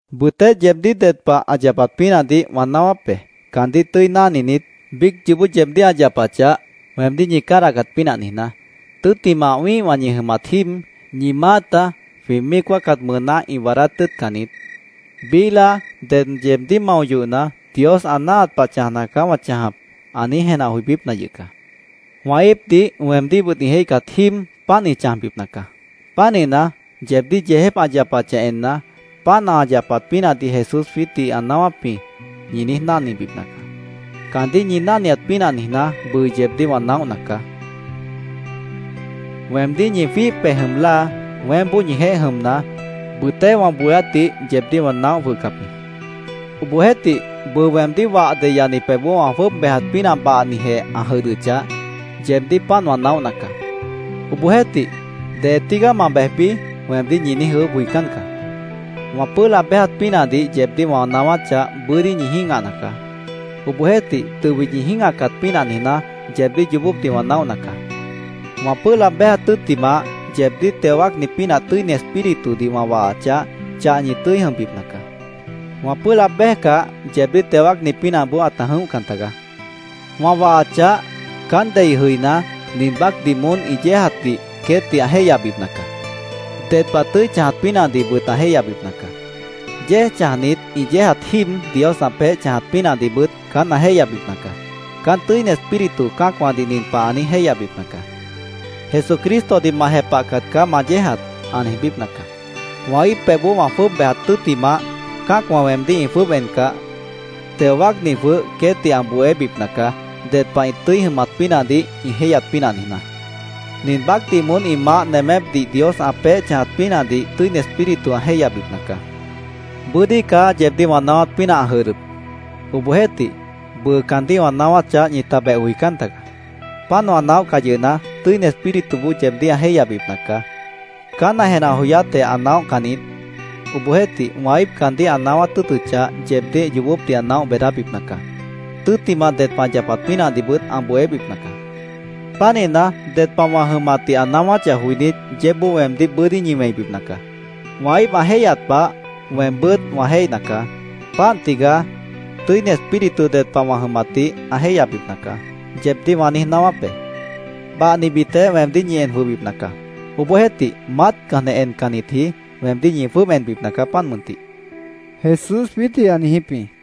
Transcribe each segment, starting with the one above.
“Bʉtéh yeebdíh ded pah ã yapat pínahdih wã naáwáp be, caandíh tʉ́i náhninit, biíc yoobó yeebdíh ã yapachah, weemdíh ñi cádahcat pínah niijná. Tʉ́ttimah, wĩ́ihwã ñi jʉmat jíib, ñi maáta jwĩ míic wáacat mʉʉná ĩ waadát tʉ́ʉtcan niít. Biíh láa ded yeebdíh mao yohna, ‘Dios ã náahat pah chãjna caá wã chãjap’, ã niíj jenah joibípna yʉh caá. Wã íipdih, weemdíhbʉt ĩ jéihcat jíib páant ĩ chãjbipna caá. Pánihna, yeebdíh yeejép ã yapachah enna, ‘Páant ã yapat pínahdih Jesús jwiítdih ã naáwáp jĩ’, ñi niíj náhnibipna caá. Caandíh ñi náhniat pínah niijná, bʉʉ yeebdíh wã naóhna caá”, Jesús jwiítdih ã niijíp jĩ. “Weemdíh ñi jwíih pej jʉm láa weémboó ñijeéh jʉmna, bʉtéh wã bohéátdih yeebdíh wã naóh jwʉhcap jĩ. Obohjeéhtih, bʉʉ weemdíh wah deyani pebhboó wã jwʉ́ʉb béjat pínah bahnijeh ã jʉdhdʉchah, yeebdíh páant wã naóhna caá. Obohjeéhtih, ‘¿Dee tígaá ma bejbi?’ weemdíh ñi niíj ʉʉ́bh joicán caá. Wã pʉ́ʉh laab béjat pínahdih yeebdíh wã naáwáchah, bʉ́dí ñi jĩ́gahna caá. Obohjeéhtih, tʉbit ñi jĩ́gahcat pínah niijná, yeebdíh yoobópdih wã naóhna caá. Wã pʉ́ʉh laab béjat tʉ́ttimah, yeebdíh teo wáacni pínah, Tʉ́ini Espíritudih wã wahachah, chah ñi tʉ́i jʉmbipna caá. Wã pʉ́ʉh laab béjcah, yeebdíh teo wáacni pínahboó ãta jʉ̃óhcan tagaá. Wã wahachah, caán dei jʉiná, nin baácdih moón ĩ yéejatdih queétdih ã jéihyabipna caá. Ded pah tʉ́i chãjat pínahdihbʉt ã jéihyabipna caá. Yéej chãjnitdih ĩ yéejat jíib Dios ã peéh chãjat pínahdihbʉt caán ã jéihyabipna caá. Caán Tʉ́ini Espíritu cã́acwãdih nin pah ã niíj jéihyabipna caá: ‘Jesucristodih ma jepahcat caá ma yéejat’, ã niijbípna caá. Wã íip pebhboó wã jwʉ́ʉb bejat tʉ́ttimah, cã́acwã weemdíh ĩ jwʉ́ʉb encah, Teo Wáacni jwʉh queétdih ã bohébipna caá, ded pah ĩ tʉ́i jʉmat pínahdih ĩ jéihyat pínah niijná. Nin baácdih moón ĩ maáh nemépdih Dios ã peéh chãjat pínahdih Tʉ́ini Espíritu ã jéihyabipna caá. “Bʉ́dí caá yeebdíh wã naáwát pínah ã jʉdhdʉp. Obohjeéhtih, bʉʉ caandíh wã naáwáchah, ñita beh joicán tagaá. Páant wã naóhcah yʉhna, Tʉ́ini Espírituboó yeebdíh ã jéihyabipna caá. Caán ã jenah joyátjeh ã naóhcan niít. Obohjeéhtih, wã íip caandíh ã naáwát tʉ́ʉtʉchah, yeebdíh yoobópdih ã naóh beedábipna caá. Tʉ́ttimah ded pah ã yapat pínahdihbʉt ã bohébipna caá. Pánihna, ded pah wã jʉmatdih ã naáwáchah joinít, yeébboó weemdíh bʉ́dí ñi wẽibipna caá. Wã íip ã jéihyat pah, weembʉ́t wã jéihna caá. Páant tigaá ‘Tʉ́ini Espíritu ded pah wã jʉmatdih ã jéihyabipna caá’, yeebdíh wã niíj naáwáp be. “Bahnibitjeh weemdíh ñi en jwʉhbipna caá. Obohjeéhtih, maátcanjeh encannitji, weemdíh ñi jwʉ́ʉb enbipna caá, páant mʉntih”, Jesús jwiítdih ã niijíp jĩ.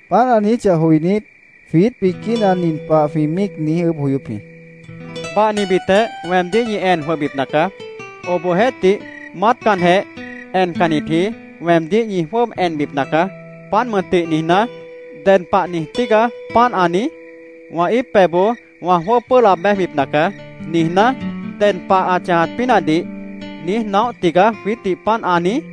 Páant ã niijíchah joinít, jwiít biquína nin pah jwĩ míic niíj ʉʉ́bh joyóp jĩ: —‘Bahnibitjeh weemdíh ñi en jwʉhbipna caá. Obohjeéhtih, maátcanjeh encannitji, weemdíh ñi jwʉ́ʉb enbipna caá, páant mʉntih’, niijná, ¿ded pah niij tígaá páant ã niíj? ‘Wã íip pebhboó wã jwʉ́ʉb pʉ́ʉh laab béjbipna caá’, niijná, ¿ded pah ã chãjat pínahdih niíj naóh tigaá jwiítdih páant ã niíj?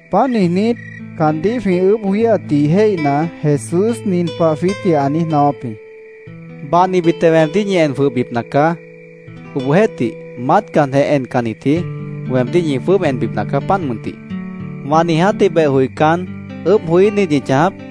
Páant niijnít, caandíh jwĩ ʉʉ́bh joííhatdih jéihna, Jesús nin pah jwiítdih ã niíj naáwáp jĩ: —‘Bahnibitjeh weemdíh ñi en jwʉhbipna caá. Obohjeéhtih, maátcanjeh encannitji, weemdíh ñi jwʉ́ʉb enbipna caá páant mʉntih’, ¿wã niijátdih beh joicán, ʉʉ́bh joííh niít ñi chãjap?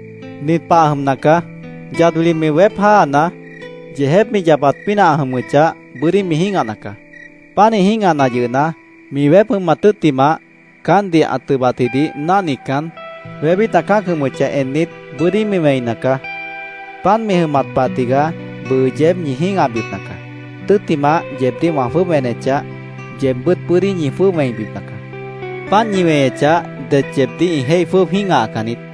Nin pah ã jʉmna caá: Yad wili mi weép jáana, yeejép mi yapat pínah ã jʉmʉchah, bʉ́dí mi jĩ́gahna caá. Pánih jĩ́gahna yʉhna, mi weép jʉmat tʉ́ttimah, caántdih ã tʉbatjidih náhnican, wébít ã cã́ac jʉmʉchah ennit, bʉ́dí mi wẽina caá. Páant mi jʉmat pah tigaá bʉʉ yeéb ñi jĩ́gahbipna caá. Tʉ́ttimah, yeebdíh wã jwʉ́ʉb enechah, yeebbʉ́t bʉ́dí ñi jwʉ́ʉb wẽibipna caá. Páant ñi weñechah, det yeebdíh ĩ jéih jwʉ́ʉb jĩ́gahacan niít.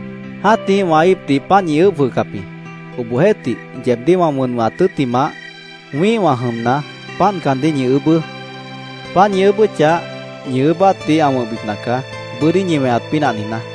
Jã́tih wã íipdih páant ñi ʉʉ́bh jwʉhcap jĩ. Obohjeéhtih, yeebdíh wã wʉn wʉ̃hat tʉ́ttimah, wĩ́ihwã jʉmna, páant caandíh ñi ʉʉ́bʉ́. Páant ñi ʉʉ́bʉ́chah, ñi ʉʉ́bátdih ã wʉ̃hbipna caá, bʉ́dí ñi weñat pínah niijná.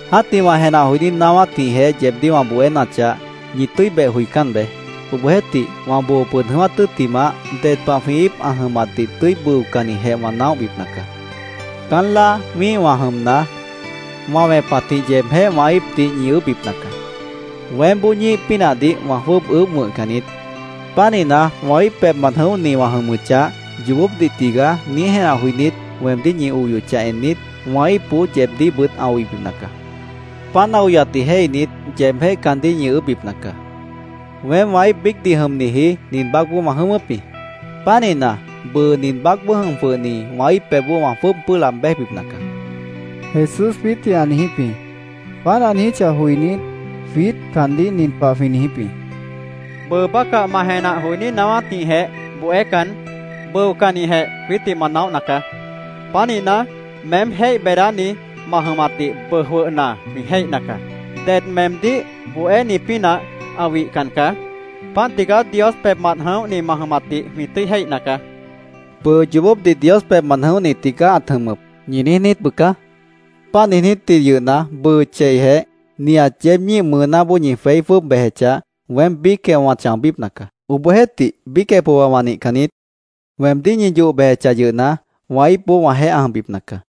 “Jã́tih wã jenah joiní naáwátjĩhjeh yeebdíh wã bohénachah, ñi tʉ́i beh joicán beé. Obohjeéhtih, wã boo pʉd jʉ̃ʉ́wát tʉ́ttimah, ded pah jwĩ íip ã jʉmatdih tʉ́i bʉocannijeh wã naóhbipna caá. Caán láa wĩ́ihwã jʉmna, wã wẽpatjĩh yeebjéh wã íipdih ñi ʉʉ́bhbipna caá. Weémboó ñíih pínahdih wã jwʉ́ʉb ʉʉ́bh wʉ̃hcan niít. Pánihna, wã íip pebhmant jʉ̃óhni wã jʉmʉchah ‘Yoobópdih tigaá’, niíj jenah joinít, weemdíh ñi oyochah ennit, wã íipboó yeebdíhbʉt ã oibipna caá. Páant ã oyatdih jéihnit, yeebjéh caandíh ñi ʉʉ́bhbipna caá. Weém wã íip biícdih jʉmniji nin baácboó wã jʉ̃ʉ́wʉ́p jĩ. Pánihna, bʉʉ nin baácboó jʉm jwʉhni wã íip pebhboó wã jwʉ́ʉb pʉ́ʉh laab béjbipna caá”, Jesús jwiítdih ã niijíp jĩ. Páant ã niijíchah joinít, jwiít caandíh nin pah jwĩ niijíp jĩ: —Bʉʉ bácah ma jenah joiní naáwátjĩhjeh bohécan, bʉocannijeh jwiítdih ma naóhna caá. Pánihna, meém jéih beedáni ma jʉmatdih bʉʉ jwʉhna jwĩ jéihna caá. Ded meemdíh bohéni pínah ã wihcan caá. Páant tigaá Dios pebhmant jʉ̃óhni ma jʉmatdih jwĩ tʉ́i jéihna caá, jwĩ niijíp jĩ. —Bʉʉ ‘Yoobópdih Dios pebhmant jʉ̃óhni tigaá ãt jʉmʉp’, ¿ñi niíj niít bʉca? Páant niijnítji yʉhna, bʉʉ cheijeh nihat yeéb ñíih mʉʉnáboó ñi jweí jwʉ́ʉb bejechah, weém biícjeh wã chãobípna caá. Obohjeéhtih, biícjeh pohba wã nihcan niít. Weemdíh ñi yoh bejechah yʉhna, wã íipboó wãjeéh ã jʉmbipna caá.